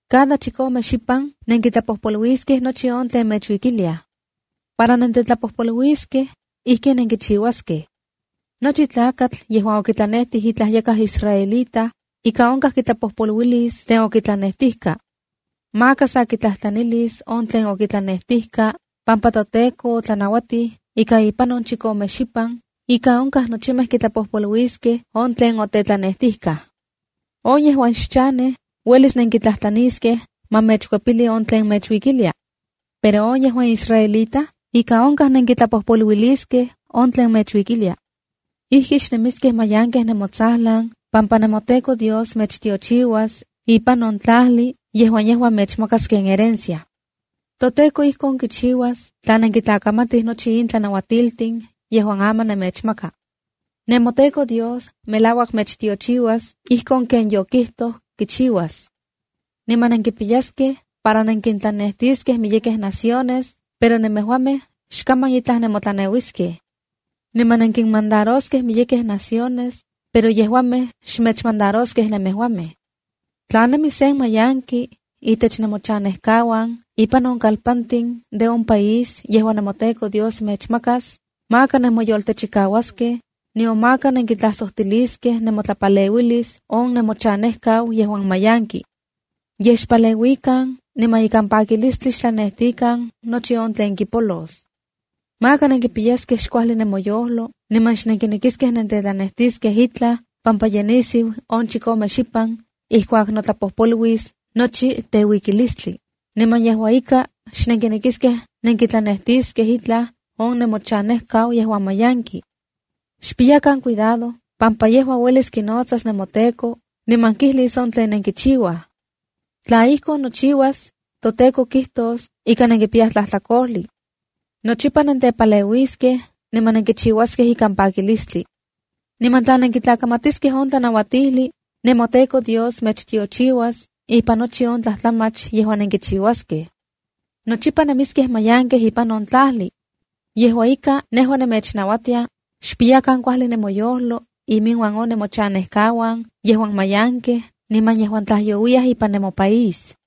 ’Cada chikome xipan nenkitlapojpoluiskej nochi on tlen mechuikiliaj. Para nentetlapojpoluiskej, ijkin nenkichiuaskej: Nochi tlakatl yejuan okitlanejtij itlaj yakaj israelita, ika onkaj kitlapojpoluilis tlen otetlanejtijka. Maka sa kitlajtlanilis on tlen okitlanejtijka, pampa toTEKO otlanauatij ika ipan on chikome xipan, ika onkaj nochimej kitlapojpoluiliskej on tlen okitlanejtijkaj. On yejuan xchanej uelis nenkitlajtlaniskej ma mechkuepili on tlen mechuikilia. Pero on yejuan israelita ika onkaj nenkitlapojpoluiliskej on tlen mechuikilia. Ijki xnemiskej mayankej nemotsajlan pampa nemoTEKO Dios mechtiochiuas ipan on tlajli yejuan yejua mechmakas ken herencia. ToTEKO ijkon kichiuas tla nenkitlakamatij nochi in tlanauatiltin yejuan aman nemechmaka. NemoTEKO Dios melauak mechtiochiuas ijkon ken yokijtoj kichiuas. Niman nenkipiyaskej para nenkintlanejtiskej miyekej naciones, pero nemejuamej xkaman itlaj nemotlaneuiskej. Niman nenkinmandaroskej miyekej naciones pero yejuamej xmechmandaroskej nemejuamej. Tla nemi sen mayanki intech nemochanejkauan ipan on kalpantin de on país yejuan nemoTEKO Dios mechmakas, maka nenmoyoltechikauaskej, nion maka nenkitlajsojtiliskej nemotlapaleuilis on nemochanejkau yejuan mayanki. Yej xpaleuikan niman ikan pakilistli xtlanejtikan nochi on tlen kipolos. Maka nenkipiyaskej xkuajli nemoyojlo niman xnenkinekiskej nentetlanejtiskej itlaj pampa ye nisiu on chikome xipan ijkuak notlapojpoluis nochi teuikilistli, niman yejua ika, xnenkinekiskej nenkitlanejtiskej itlaj on nemochanejkau yejuan mayanki. Xpiyakan cuidado pampa yejua uelis kinotsas nemoTEKO niman kijlis on tlen nenkichiuaj. Tla ijkon nochiuas, toTEKO kijtos ika nenkipiyaj tlajtlakojli. Nochipa nentepaleuiskej, niman nenkichiuaskej ikan pakilistli. Niman tla nenkitlakamatiskej on tlanauatijli, nemoTEKO Dios mechtiochiuas ipan nochi on tlajtlamach yejuan nenkichiuaskej. Nochipa nemiskej mayankej ipan on tlajli. Yejua ika, nejua nemechnauatia, xpiyakan kuajli nemoyojlo iminuan on nemochanejkauan yejuan mayankej niman yejuan tlajyouiyaj ipan nemopaís.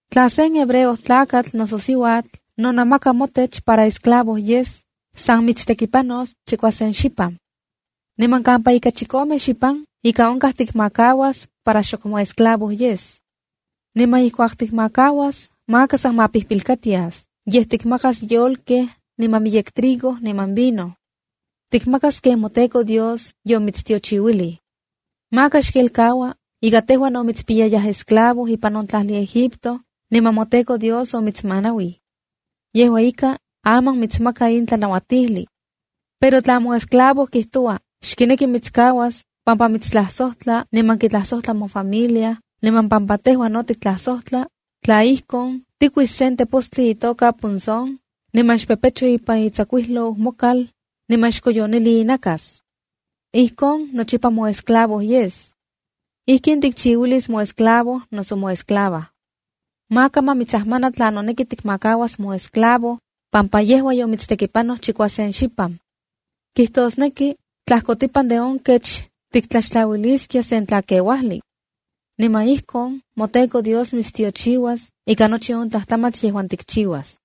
’Tla sen Hebreo tlakatl noso siuatl, nonamaka motech para esclavo yes, san mitstekipanos chikuasen xipan. Niman kampa ika chikome xipan ika onkaj tikmakauas para xok moesclavo yes. Niman ijkuak tikmakauas, maka san mapijpilkatias, yej tikmakas yolkej niman miyek trigo niman vino. Tikmakas ken moTEKO Dios yomitstiochiuilij. Maka xkelkaua ika tejua no mitspiyayaj esclavo ipan on tlajli Egipto, niman moTEKO Dios omitsmanauij. Yejua ika, aman nimitsmaka in tlanauatijli. ’Pero tla moesclavo kijtoua xkineki mitskauas pampa mitstlajsojtla niman kitlajsojtla mofamilia niman pampa tejua no tiktlajsojtla, tla ijkon, tikuis sen tepostli itoka punzón, niman xpepecho ipan itsakuijlou mokal niman xkoyonili inakas. Ijkon nochipa moesclavo yes. Ijkin tikchiuilis moesclavo noso moesclava. Maka ma mitsajmana tla noneki tikmakauas moesclavo, pampa yejua yomitstekipanoj chikuasen xipan. Kijtosneki tlajkotipan de on kech tiktlaxtlauiliskia sen tlakeuajli. Niman ijkon moTEKO Dios mitstiochiuas ika nochi on tlajtlamach yejuan tikchiuas.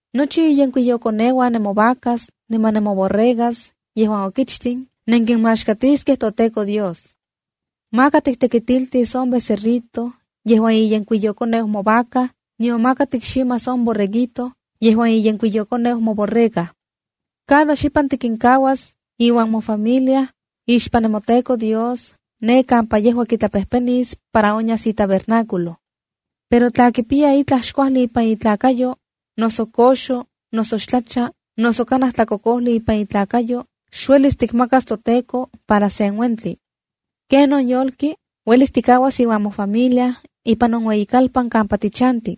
’Nochi inyenkuiyokoneuan nemovacas niman nemoborregas yejuan okichtin, nenkinmaxkatiskej toTEKO Dios. ’Maka tiktekitiltis on becerrito yejuan iyenkuiyou movaca, nion maka tikximas on borreguito yejuan iyenkuiyokoneu moborrega. Cada xipan tikinkuas iuan mofamilia ixpan nemoTEKO Dios ne kampa yejua kitlapejpenis para onyas itabernáculo. Pero tla kipiya itlaj xkuajli ipan itlakayo, noso koxo, noso xtlacha, noso kanaj tlakokojli ipan itlakayo xuelis tikmakas toTEKO para sen uentli. Kenon yolki, uelis tikuas iuan mofamilia ipan on ueyikalpan kampa tichanti.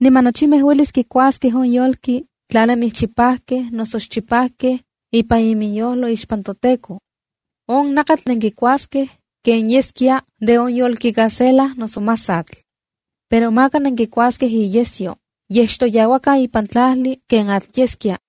Niman nochimej uelis kikuaskej on yolki tla nemij chipajkej noso xchipajkej ipan iminyojlo ixpan toTEKO. On nakatl nenkuaskej ken yeskia de de yolki gacela noso masatl. Pero maka nenkikuaskej iyesyo. Yej xtoyauakan ipan tlajli ken atl yeskia.